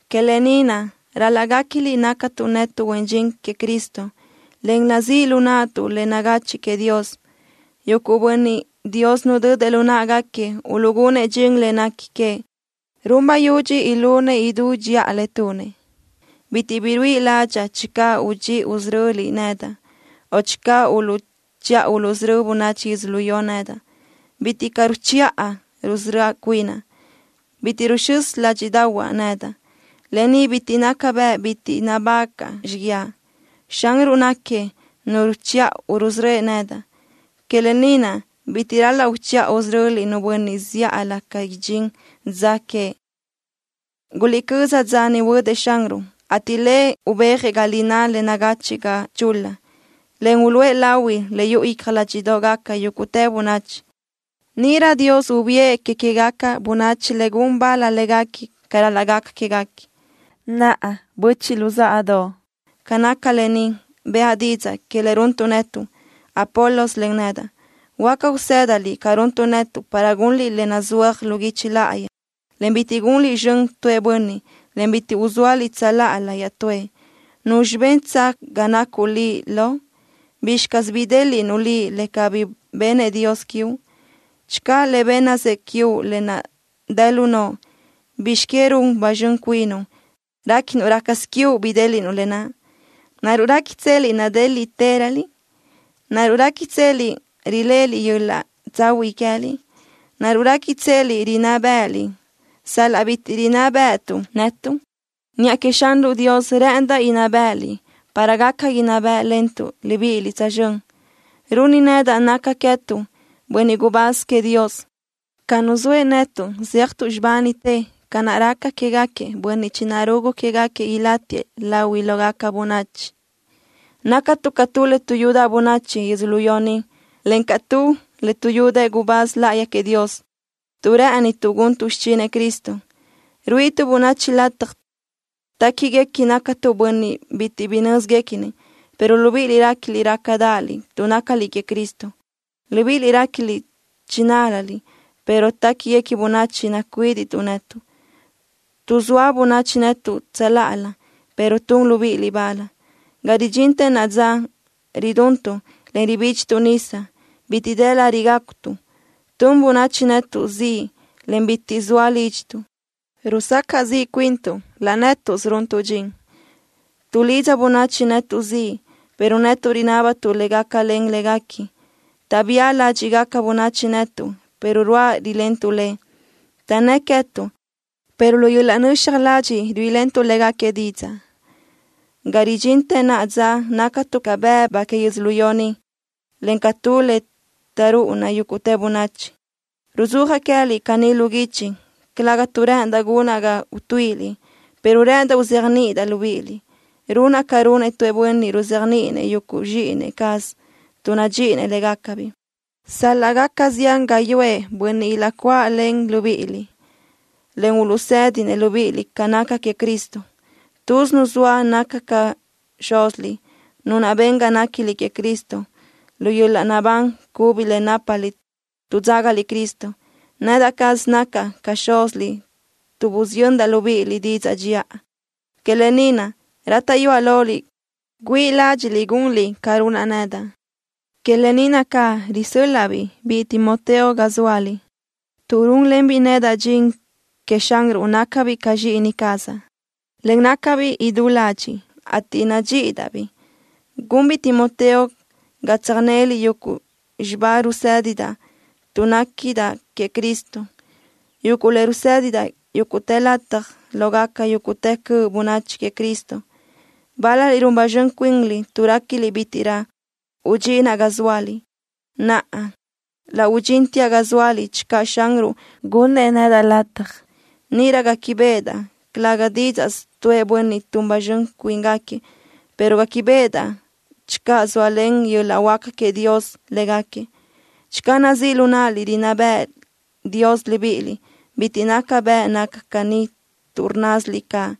Que lë ni naʼ, ral-laʼ guéquiliʼ nácatuʼ netuʼ huen dxin queëʼ Cristo, en nazíʼ lu naʼtuʼ le nagachiʼ queëʼ Dios. Yuguʼ bönniʼ, Dios nudödëʼ lu náʼagaquiëʼ uluʼgunëʼ dxin le nequi queëʼ, run bayudxi ilunëʼ idú dxiʼa le tunëʼ. Bitiʼ bi ruíʼi ládxaʼa channö uchiʼa usöröliʼ nedaʼ, o channö uluʼchiʼa uluʼsörö́ bönachi yödzölió ni nedaʼ. Bitiʼ caʼ ruchiʼa rusörö́ cuinaʼ. Bitiʼ ruxö́s ládxiʼdaʼahuaʼ nedaʼ. Lë ni bitiʼ naca bëʼ bitiʼ nabágaʼa xíguiaʼ. Xanruʼ náquiëʼ Nu ruchiʼa rusörö́ëʼ nedaʼ. Que lë ni naʼ, bitiʼ ral-laʼ uchiʼa usöröliʼ nu bönniʼ zíʼalö ca idxín dza que. Guliʼcö́z dza niʼ huödëʼ Xanruʼ, ateʼ Lëʼ ubéajëʼ ga lináʼ le nagachiʼ ga chul-la, en uluʼë lahui le yuʼu icja ládxiʼdoʼgaca yúguʼtë bönachi. Níʼirö Dios ubiʼë que queë́gaca bönachi le gun bal léguequi ca ral-laʼ gaca quéguequi. Naʼa, böchiʼ luzáʼadoʼ, ca naca lë ni, bëʼa didzaʼ que le runtuʼ netuʼ, Apolos, en nedaʼ. Huáca usë́daliʼ ca runtuʼ netuʼ para gunliʼ le nazúajsö lu guichi láʼayi, en bitiʼ gunliʼ zxön tuëʼ bönniʼ, en bitiʼ uzóaliʼ tsöláʼalö iaʼtúëʼ. ¿Nuzxi bentsö ga nacuʼ liʼ lo? ¿Bizxi caz bidéliʼnuʼ liʼ le cabí bennëʼ Dios quiuʼ? Channö Lëʼ bénnasëʼ quiuʼ lë naʼ dë lu noʼo, ¿bizx que run ba zxön cuinuʼ, réquinuʼ rácasö quiuʼ bidéliʼnuʼ lë naʼ? ¿Naruʼ réquitseliʼ nadéliʼtëröliʼ? ¿Naruʼ réquitseliʼ riléʼeliʼ yöl-laʼ tsahuiʼ queë́liʼ? ¿Naruʼ réquitseliʼ rinná bë́ʼëliʼ, sal-laʼ bitiʼ rinná bë́ʼëtuʼ netuʼ? Niʼa queëʼ Xanruʼ Dios rë́ʼëndaʼ inná bë́ʼëliʼ para gaca inná bë́ʼlentuʼ libíʼiliʼ tsözxö́n. Runi nedaʼ naca queë́tuʼ, bönniʼ gubáz queëʼ Dios, ca nuzóëʼ netuʼ zéajtuʼ xibánitë ca naʼ raca quégaquiëʼ bönniʼ chinarugu quégaquiëʼ ilátiëʼ lahuiʼ lógaca bönachi. Nácatuʼ ca tu le tuʼyudaʼ bönachi yödzölió ni, encaʼ ca tu le tuʼyúdëʼë gubáz láʼayi queëʼ Dios. Tuʼ rë́ʼënituʼ guntuʼ xichinëʼ Cristo, ruíʼituʼ bönachi lataj téquiguequi nácatuʼ bönniʼ bitiʼ bi nö́zquequinëʼ, pero libíʼiliʼ réquiliʼ rácadaʼaliʼ tuʼ nácaliʼ queëʼ Cristo. Libíʼiliʼ réquiliʼ chinál-laliʼ, pero téquiguequi bönachi nacuídiʼtuʼ netuʼ. Tuʼzóa bönachi netuʼ tsöláʼalö, pero tun libíʼiliʼ bal. Ga ridxintë naʼa dza, riduntuʼ, en ribídxituʼ nisa. Bitiʼ dë lariʼ gácutuʼ. Tun bönachi netuʼ ziʼ, en bitiʼ zoa lídxituʼ. Rusacaʼ ziʼ cuintuʼ, laʼ nétuʼsö runtuʼ dxin. Tuʼlidza bönachi netuʼ ziʼ, pero netuʼ rinábatuʼ le gácalen léguequi. Taʼbía ládxiʼgaca bönachi netuʼ, pero ruáʼ rilentuʼ le. Taʼnnë́ʼ queë́tuʼ, pero lu yöl-laʼ nöxaj ladxiʼ ruíʼilentuʼ légaquiëʼ didzaʼ. Ga ridxintë naʼa dza nácatuʼ ca bëbu que yödzölió ni, en ca tu le taʼrúʼuna yúguʼtë bönachi. Ruzúajaʼ queë́liʼ caní lu guichi, calëga tuʼ rë́ʼëndaʼ gunaʼ ga utuíʼiliʼ, pero rë́ʼëndaʼ uzéajniʼidaʼ libíʼiliʼ, runaʼ ca runëʼ tu bönniʼ ruzéajniʼinëʼ yuguʼ zxíʼini cazëʼ tuʼ nadxíʼinëʼ légacabiʼ. Sal-laʼ gaca zián gáyuʼë bönniʼ ilaʼcuáʼalen libíʼiliʼ, en uluʼsédinëʼ libíʼiliʼ ca naca queëʼ Cristo, tuz nu zoa naca ca xúziliʼ, nu naʼ ben ga néquiliʼ queëʼ Cristo. Lu yöl-laʼ naʼbán cubi le nápaliʼ tuʼ dzágaliʼ Cristo, nedaʼ caz nacaʼ ca xúziliʼ tuʼ busiyöndaʼ libíʼiliʼ didzaʼ dxiʼa. Que lë ni naʼ, rátaʼyuaʼ loliʼ güíʼi ládxiʼliʼ gunliʼ ca runaʼ nedaʼ. Que lë ni naʼ caʼ risö́l-laʼa-biʼ biʼi Timoteo ga zóaliʼ. Tuʼ rúnlenbiʼ nedaʼ dxin queëʼ Xanruʼ nácabiʼ ca zxíʼini cazaʼ, en nácabiʼ idú ladxiʼ, ateʼ nadxíʼidaʼ-biʼ. Gunbiʼ Timoteo ga tsöjnéliʼ yuguʼ xibá rusédidaʼ tuʼ néquidaʼ queëʼ Cristo, yuguʼ le rusédidaʼ yúguʼtë lataj lógaca yúguʼtë cöʼ bönachi queëʼ Cristo. Bál-laliʼ run ba zxön cuinliʼ tuʼ réquiliʼ bítiʼrö udxinaʼ ga zóaliʼ. Naʼa, laʼ udxínteaʼ ga zóaliʼ channö Xanruʼ gunnëʼ nedaʼ lataj. Níʼirö guéquibeʼedaʼ, calë́gasö didzaʼ tuʼë bönniʼ tun ba zxön cuíngaquiëʼ, pero guéquibeʼedaʼ channö zóalen yöl-laʼ huáca queëʼ Dios légaquiëʼ. Channö nazíʼ lu náʼaliʼ rinná béʼenëʼ Dios libíʼiliʼ, bitiʼ naca bëʼ naca caní tuʼ rnnásiliʼ caʼ.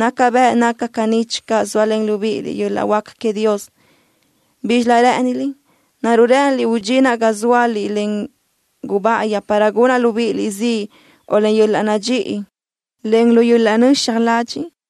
Naca bëʼ naca caní channö zóalen libíʼiliʼ yöl-laʼ huáca queëʼ Dios. ¿Bízxilö rë́ʼëniliʼ? ¿Naruʼ rë́ʼëniliʼ udxinaʼ ga zóaliʼ len gubáʼayi, para gunaʼ libíʼiliʼ ziʼ, o len yöl-laʼ nadxíʼi, en lu yöl-laʼ nöxaj ladxiʼ?